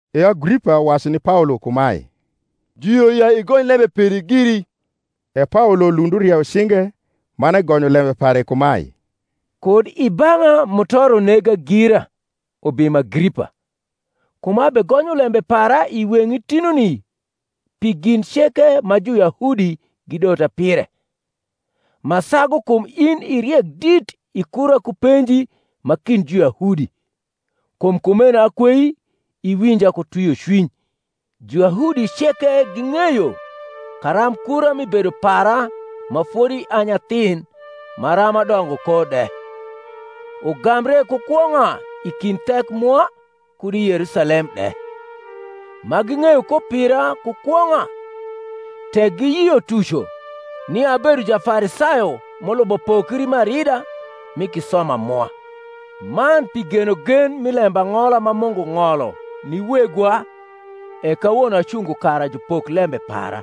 E Agripa wacu ni Paolo kumae, Juyio ya igony lembe peri giri. E Paolo lund urieyo cinge, man egonyo lembe pare kumae: Kud i bang’a mutoro nega gira, ubimo Agripa, kum abegonyo lembe para i weng’i tinuni pi gin ceke ma Juyahudi gidota pire: ma sagu kum in i riek dit i kura ku penji ma kind Juyahudi: kum kumeno akwei iwinja ku twiocwiny. Juyahudi ceke ging’eyo karamb kura mi bedo para ma fodi a nyathin maram adongo ko de, ugambre ku kwong’a i kind thek mwa, kud i Yerusalem de; ma ging’eyo ko pira ku kwong’a, tek giyio tuco, nia abedo Jafarisayo m’ulubo pokri m’arida mi kisoma mwa. Man pi genogen mi lembang’ola ma Mungu ng’olo ni wegwa e kawono acungo kara jupok lembe para;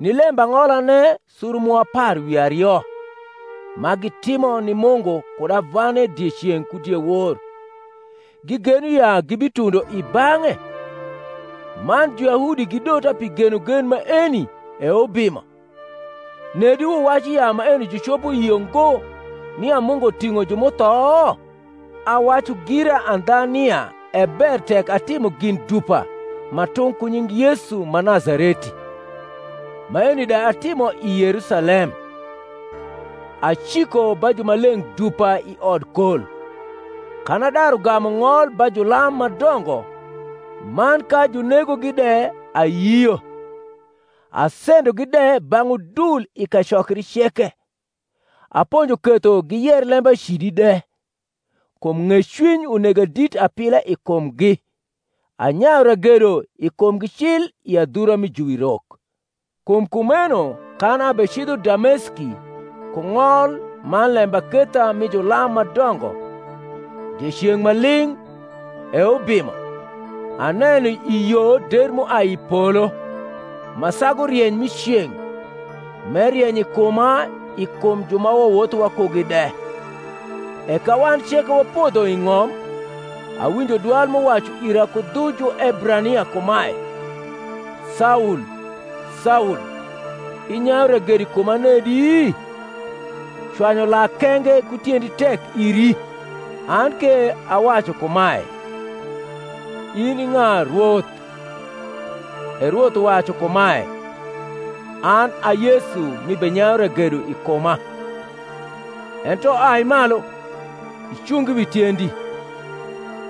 ni lembang’olane suru mwa apar wi ario, ma gitimo ni Mungu kud avane dieceng’ ku diewor, gigeno ya gibitundo i bang’e. Man Juyahudi gidota pi genogen maeni, E ubimo! Nedi wuwacu ya maeni jucopo yio ngo, nia Mungu ting’o ju m’utho? Awacu gira andha nia e ber tek atimo gin dupa ma tung’ ku nying Yesu ma Nazareti. Maeni de atimo i Yerusalem: aciko ba jumaleng’ dupa i odkol, kan adaru gamu ng’ol ba julam ma dongo, man ka junegogi de ayio. Asendogi de bang’ udul i kacokri ceke, aponjo ketho giyer lembacidi de; kum ng’ecwiny unega dit apila i kumgi, anyayu ragedo i kumgi cil i adhura mi juwirok. Kum kumeno kan abecidho Dameski ku ng’ol man lembaketha mi julam ma dongo, dieceng’ ma ling’, E ubimo, aneno i yo der m’uai i polo, ma sagu rieny mi ceng’, m’erieny i kuma i kum ju ma wawotho wakugi de. E ka wan ceke wapodho i ng’om, awinjo dwal m’uwacu ira ku dhu Juebrania kumae, Saul, Saul, inyayu ragedo i kuma nedi? cwanyu lak kenge ku tiendi tek iri. An ke awacu kumae, In i ng’a, Rwoth? E Rwoth uwacu kumae, An a Yesu m’ibenyayu ragedo i kuma. Ento ai malu, icung wi tiendi: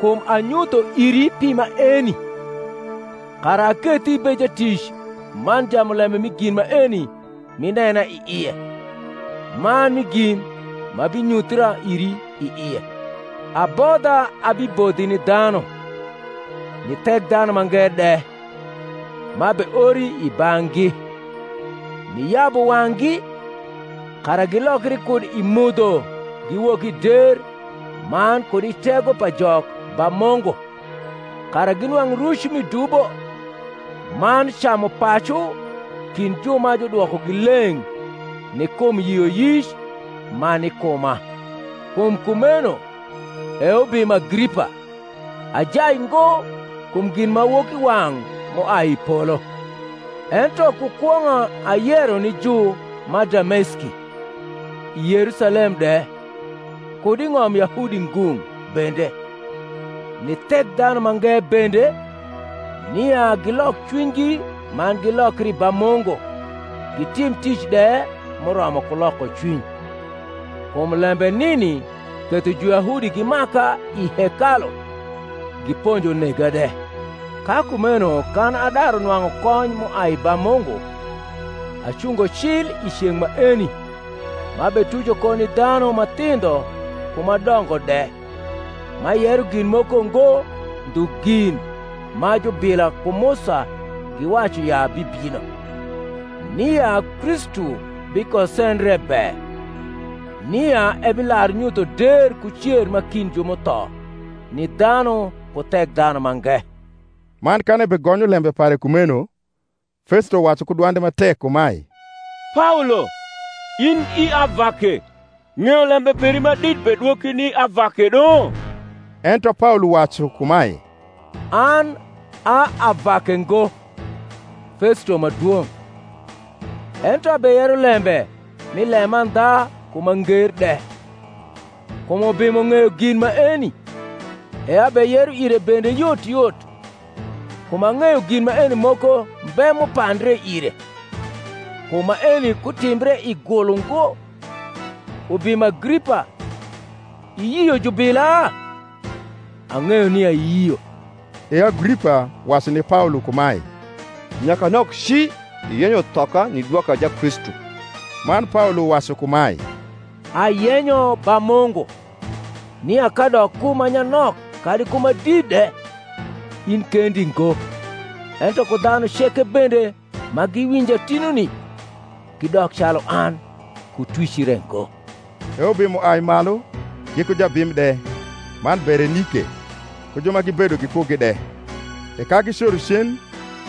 kum anyutho iri pi maeni, kara akethi ibed jatic man jamulembe mi gin maeni m’inena i ie, man mi gin m’abinyuthra iri i ie; abodha abibodhi ni dhanu, ni Thekdhanumange de, m’abeori i bang’gi, niyabu wang’gi, kara gilokri kud i mudho giwok i der man kud i tego pa Jok ba Mungu, kara ginwang’ ruc mi dubo, man camupacu kind ju ma judwokogi leng’ ni kum yioyic ma ni kuma. Kum kumeno, E ubimo Agripa, ajai ngo kum ginmawokiwang’ m’uai i polo: ento ku kwong’a ayero ni ju ma Dameski, i Yerusalem de, kud i ng’om Yahudi ngung’ bende, ni Thekdhanumange bende, nia gilok cwinygi man gilokri ba Mungu, gitim tic de m’uromo ku lokocwiny. Kum lembe nini ketho Juyahudi gimaka i hekalu, giponjo nega de. Ka kumeno kan adaru nwang’u kony m’uai ba Mungu, acungo cil i ceng’ maeni m’abetuco ko ni dhanu ma thindho ku ma dongo de, m’ayero gin moko ngo ndhu gin ma jubila ku Musa giwacu ya bibino; nia Kristu bikosendre be, nia ebilar nyutho der ku cer ma kind ju m’utho ni dhanu ku Thekdhanumange. Man kan ebegonyo lembe pare kumeno, Festo wacu ku dwande ma tek kumae, Paolo, in i avake; ng’eyo lembe peri ma dit bedwoki ni avake do. Ento Paolo wacu kumae, An a avake ngo, Festo ma dwong’: ento abeyero lembe mi lemandha ku ma nger de. Kum ubimo ng’eyo gin maeni, e abeyero ire bende yot yot: kum ang’eyo gin maeni moko mbe m’upandre ire; kum maeni kutimbre i gul ungo. Ubimo Agripa, iyio jubila? Ang’eyo nia iyio. E Agripa wacu ni Paolo kumae, Nyakanok ci iyenyo thoka ni dwoka Jakristu. Man Paolo wacu kumae, Ayenyo ba Mungu, nia kadok ku ma nyanok kadi ku ma dit de, in kendi ngo, ento ku dhanu ceke bende ma giwinja tinuni, gidok calu an, ku twic re ngo. E ubimo ai malu, giku jabim de, man Berenike, ku ju ma gibedo gikugi de: e ka gicoro cen,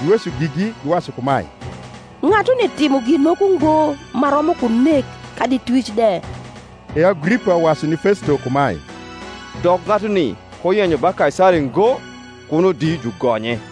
giweco gigi, giwacu kumae, Ng’atuni timo gin moko ngo ma romo ku nek kadi twic de. E Agripa wacu ni Festo kumae, Dok ng’atuni kuyenyo ba Kaisari ngo, kuno di jugonye.